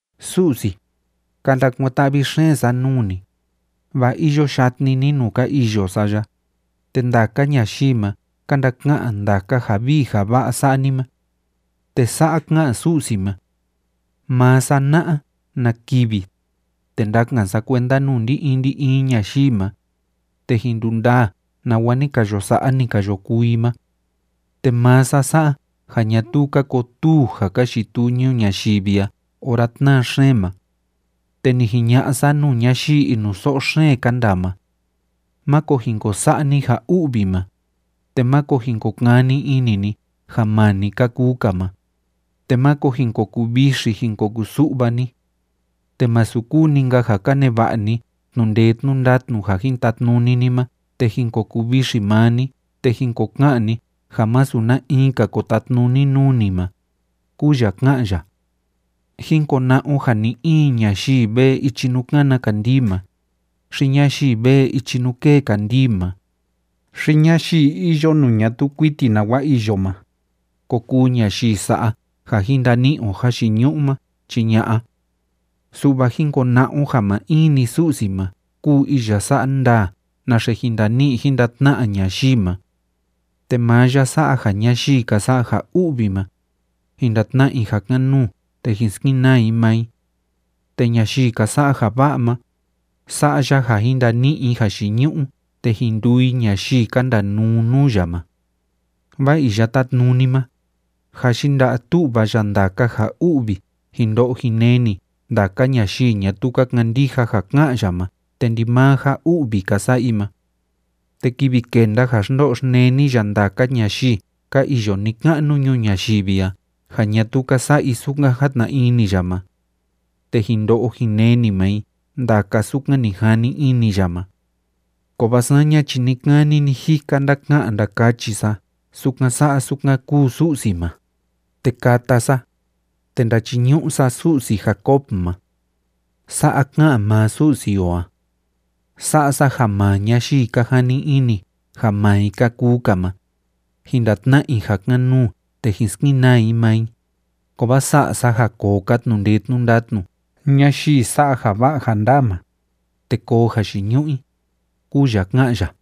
Su'si, ka ndakuan‑ta'vi xeen sa nuu ni, vaa iyo yatni ni nuu ka iyo sa ya, te ndaka ñayii ma ka ndaka'an ndaka ja vii ja va'a sa'a ni ma. Te sa'a ka'an Su'si ma: “Maa sa na'a na kivi, te ndakan sa kuenda nuu ndi‑in ndi‑in ñayii ma, te jin ndundaa nawa ni ka yo sa'a, ni ka yo kuu i ma. Te maa sa sa'a ja ñatuu ka kotuu ja ka yituu ñuu ñayivi a ora tnáa xeen ma. Te ni jiña'a sa nuu ñayii inuso'o xeen ka ndaa ma: Máko jin ko sa'a ni ja u'vi ma, te máko jin ko kani ini ni ja maa ni ka kuu‑ka ma, te máko jin ko kuvixi jin ko kusu'va ni. Te masu kuu‑ni‑nka ja ka neva'a ni tnu'u ndee tnu'u ndatnu ja jin tatnuni ni ma te jin ko kuvixi maa ni te jin ko ka'an ni ja masu na in‑ka ko tatnuni nuu ni ma”, kúu ya ká'an ya. Jín kona'a o ja ni‑in ñayii vee ichi nuu kána kandii ma, xi ñayii vee ichi nuu kée kandii ma, xi ñayii iyo nuu ñatuu kuiti nawa iyo ma, ko kuu ñayii sa'a ja jin ndani'i o jayiñu'u ma, chi ña'a. Su'va jín kona'a o ja maa in‑ni Su'si ma kúu iya sa'a ndaa naxe jin ndani'i jin ndatna'a ñayii ma. Te maa ya sa'a ja ñayii ka sa'a ja u'vi ma, jin ndatna'a i ja kan‑nuu te jin skenaa i maa i. Te ñayii ka sa'a ja va'a ma, sa'a ya ja jin ndani'i i jayiñu'u te jin nduu i ñayii ka ndanuu nuu ya ma. Vaa Iya Tátnuni ma, jâ yinda'a tu'va ya ndaka ja u'vi jin ndo'o jin neni ndaka ñayii ñatuu ka kandija ja ká'an ya ma te ndimaa ja u'vi ka sa'a i ma. Te kivi kenda ja xndo'o xneni ya ndaka ñayii ka iyo ni‑ka'nu ñuu ñayivi a ja ñatuu ka sa'a i sukan játna ini ya ma, te jin ndo'o jin neni maa i ndaka sukan ni jani ini ya ma. Kovaa saña chi ni‑kani ni‑jika ndaka'an ndakachi sa sukan sa'a sukan kúu Su'si ma, te kata sa, te ndachiñu'u sa Su'si Jacob ma. Sa'a ká'an maa Su'si o a: “Sa'a sa ja maa ñayii ka jani ini ja maa i ka kuu‑ka ma, jin ndatna'a i ja kan‑nuu te jin skenaa i maa i, kovaa sa'a sa ja koo‑ka tnu'u ndee tnu'u ndatnu ñayii sa'a ja va'a ja ndaa ma, te koo jayiñu'u i”, kúu ya ká'an ya.